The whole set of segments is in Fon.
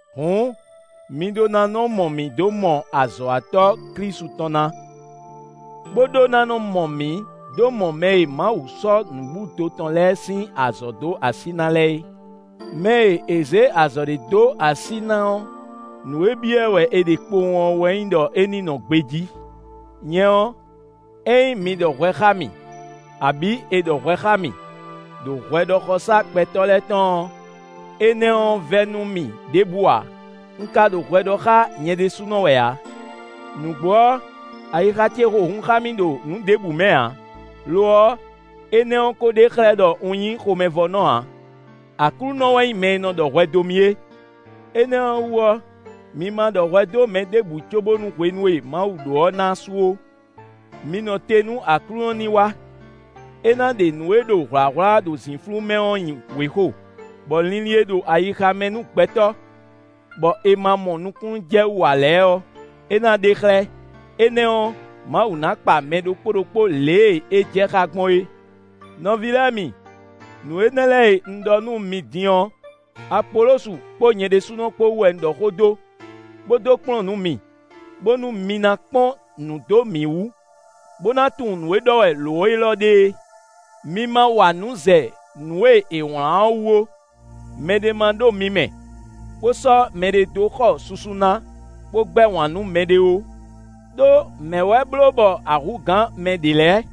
Hǔn, mi ɖó ná nɔ mɔ mǐ dó mɔ azɔ̌watɔ́ Klísu tɔn ná, bó ɖó ná mɔ mǐ dó mɔ mɛ e Mawu sɔ́ nǔbúdo tɔn lɛ́ɛ sín azɔ̌ dó así ná lɛ́ɛ é. Mɛ e è zě azɔ̌ ɖé dó así ná ɔ́, nǔ e byɔ́ ɛ wɛ è ɖe kpowun ɔ́ wɛ nyí ɖɔ é ní nɔ gbejí. Nyɛ ɔ́, ényí mi ɖɔ hwɛ xá mì, abǐ è ɖɔ hwɛ xá mì, ɖo hwɛɖɔxɔsá gbɛtɔ́ lɛ́ɛ tɔn ɔ́, énɛ́ ɔ́ vɛ́ nú mì ɖěbǔ ǎ; un ka ɖo hwɛ ɖɔ xá nyɛ ɖésúnɔ wɛ ǎ. Nǔgbó ɔ́, ayixa ce xo hun xá mì ɖo nǔ ɖěbǔ mɛ ǎ; lo ɔ́, énɛ́ ɔ́ ko ɖe xlɛ́ ɖɔ un nyí xomɛvɔ́nɔ ǎ. Aklúnɔ wɛ nyí mɛ e nɔ ɖɔ hwɛ dó mì é. Énɛ́ ɔ́ wú ɔ́, mi ma ɖɔ hwɛ dó mɛ ɖěbǔ cóbónú hwenu e Mawu ɖó ɔ́ ná su ó; mi nɔ te nú Aklúnɔ ní wá: é ná ɖe nǔ e ɖo hwlǎhwlá ɖo zǐnflú mɛ ɔ́ nyi wěxo, bɔ linlin e ɖo ayixa mɛ nú gbɛtɔ́, bɔ è ma mɔ nukúnnú jɛ wú ǎ lɛ́ɛ ɔ́, é ná ɖe xlɛ́; énɛ́ ɔ́, Mawu ná kpa mɛ ɖokpó ɖokpó lě e é jɛ xá gbɔn é. Nɔví lɛ́ɛ mi, nǔ énɛ́ lɛ́ɛ e un ɖɔ nú mi din ɔ́, Apolosu kpó nyɛ ɖésúnɔ kpó wú wɛ un ɖɔ xó dó, bó dó kplɔ́n nǔ mi, bónú mi ná kpɔ́n nǔ dó mǐ wú, bó ná tunwun nǔ e ɖɔ wɛ lǒ élɔ́ ɖe é: “Mi ma wa nǔ zɛ nǔ e è wlán ɔ́ wú ó.” Mɛ ɖé ma ɖo mi mɛ, bó sɔ́ mɛɖé dó xɔ susu ná, bó gbɛ́ wǎn nú mɛɖé ó. Đó mɛ̌ wɛ bló bɔ a hú gǎn mɛ ɖě lɛ́ɛ?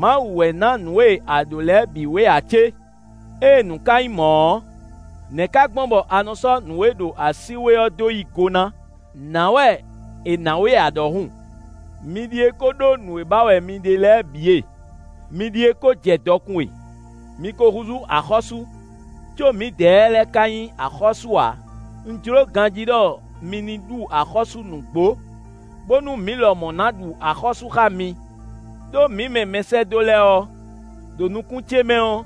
Mawu wɛ ná nǔ e a ɖǒ lɛ́ɛ bǐ we ǎ cé? Ée nǔ ka nyí mɔ̌ ɔ́, nɛ̌ ka gbɔn bɔ a nɔ sɔ́ nǔ e ɖo así we ɔ́ dó yí go ná, nǎ wɛ è nǎ we ǎ ɖɔhun? Mi ɖíe ko ɖó nǔ e ba wɛ mi ɖe lɛ́ɛ bǐ e. Mi ɖíe ko jɛ dɔkun e. Mi ko húzú axɔ́sú, có mǐdɛɛ lɛ́ɛ ka nyí axɔ́sú ǎ. Un jló ganjí ɖɔ mi ní ɖu axɔ́sú nǔgbó, bónú mǐ lɔmɔ̌ ná ɖu axɔ́sú xá mi. Đó mǐ mɛ mɛsɛ́dó lɛ́ɛ ɔ́, ɖo nukún ce mɛ ɔ́,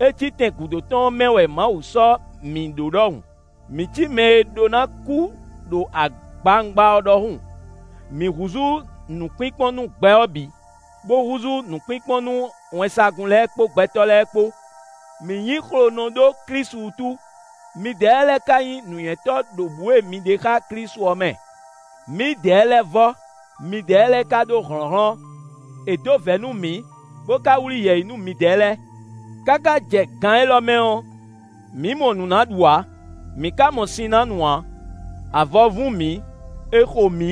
é cí tɛn gǔdo tɔn ɔ́ mɛ wɛ Mawu sɔ́ mǐ ɖó ɖɔhun; mǐ cí mɛ e ɖó ná kú ɖo agbawungba ɔ́ ɖɔhun; mǐ húzú nǔkpínkpɔ́n nú gbɛ ɔ́ bǐ, bó húzú nǔkpínkpɔ́n nú wɛnsagun lɛ́ɛ kpó gbɛtɔ́ lɛ́ɛ kpó. Mǐ nyí xlonɔ ɖó Klísu wútu; midɛɛ lɛ́ɛ ka nyí nǔnywɛ́tɔ́ ɖo bǔ e mi ɖe xá Klísu ɔ́ mɛ; mǐdɛɛ lɛ́ɛ vɔ́, midɛɛ lɛ́ɛ ka ɖó hlɔ̌nhlɔ́n; è dó vɛ̌ nú mǐ, bó ka wlí yɛ̌yi nú midɛɛ lɛ́ɛ. Káká jɛ gan élɔ́ mɛ ɔ́, mǐ mɔ nǔ ná ɖu ǎ, mǐ ka mɔ sin ná nu ǎ; avɔ vún mǐ; è xo mǐ;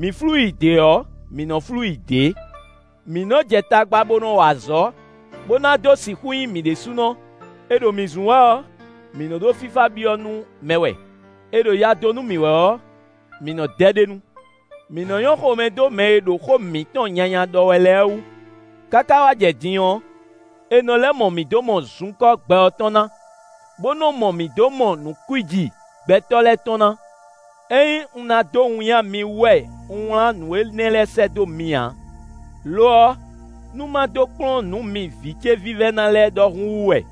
mǐ flú yi dě ɔ́, mǐ nɔ́ flú yi dě. Mǐ nɔ́ jɛ tagba bó nɔ́ wa azɔ̌, bó ná dó sixú nyí mi ɖésúnɔ; è ɖo mǐ zun wɛ ɔ́, mǐ nɔ́ ɖo fífá byɔ́ nú mɛ wɛ; è ɖo ya dó nú mǐ wɛ ɔ́, mǐ nɔ́ dɛ ɖ'é nu. Mǐ nɔ́ nyɔ́ xomɛ dó mɛ e ɖo xó mǐtɔn nyanya ɖɔ wɛ lɛ́ɛ wú. Káká wá jɛ din ɔ́, è nɔ lɛ́ mɔ mǐ dó mɔ zunkɔ́ gbɛ ɔ́ tɔn ná, bó nɔ́ mɔ mǐ dó mɔ nǔ kwíji gbɛtɔ́ lɛ́ɛ tɔn ná. Ényí un ná dó winnyá mi wú wɛ un wlán nǔ énɛ́ lɛ́ɛ sɛ́ dó mi ǎ; lo ɔ́, nú má dó kplɔ́n nǔ mi vǐ ce vívɛ́ná lɛ́ɛ ɖɔhun wú wɛ.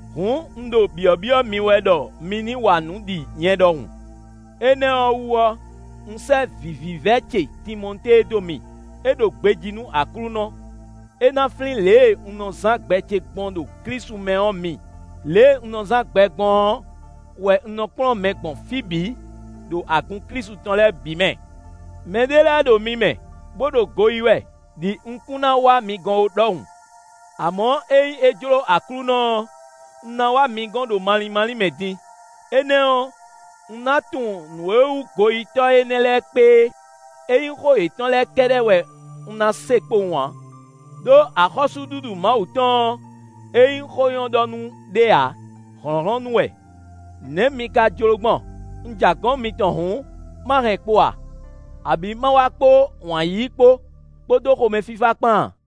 Hǔn un ɖo byɔ̌byɔ́ mi wɛ ɖɔ mi ní wa nǔ ɖi nyɛ ɖɔhun. Énɛ́ ɔ́ wú ɔ́, un sɛ́ vǐ vívɛ́ ce Timɔtée dó mi; é ɖo gbejí nú Aklúnɔ. É ná flín lě e un nɔ zán gbɛ ce gbɔn ɖo Klísu mɛ ɔ́ mi; lě e un nɔ zán gbɛ gbɔn ɔ́ wɛ un nɔ kplɔ́n mɛ gbɔn fí bǐ, ɖo agun Klísu tɔn lɛ́ɛ bǐ mɛ. Mɛ ɖé lɛ́ɛ ɖo mi mɛ, bó ɖo go yí wɛ, ɖi un kún ná wá mi gɔ́n ó ɖɔhun. Amɔ̌ ényí é jló Aklúnɔ ɔ́, un ná wá mi gɔ́n ɖo malín málín mɛ din; énɛ́ ɔ́, un ná tunwun nǔ e wú goyítɔ́ énɛ́ lɛ́ɛ kpé é; ényí xó yětɔn lɛ́ɛ kɛ́ɖɛ́ wɛ un ná se kpowun ǎ. Đó axɔ́súɖuɖu Mawu tɔn ɔ́, é nyí xó nyɔ́ ɖɔ nú ɖé ǎ; hlɔ̌nhlɔ́n nú wɛ. Nɛ̌ mi ka jló gbɔn? Un ja gɔ̌n mitɔn hǔn, ma hɛn kpo a? Abǐ ma wá kpó wǎn yíyí kpó, kpódó xomɛfífá kpán a?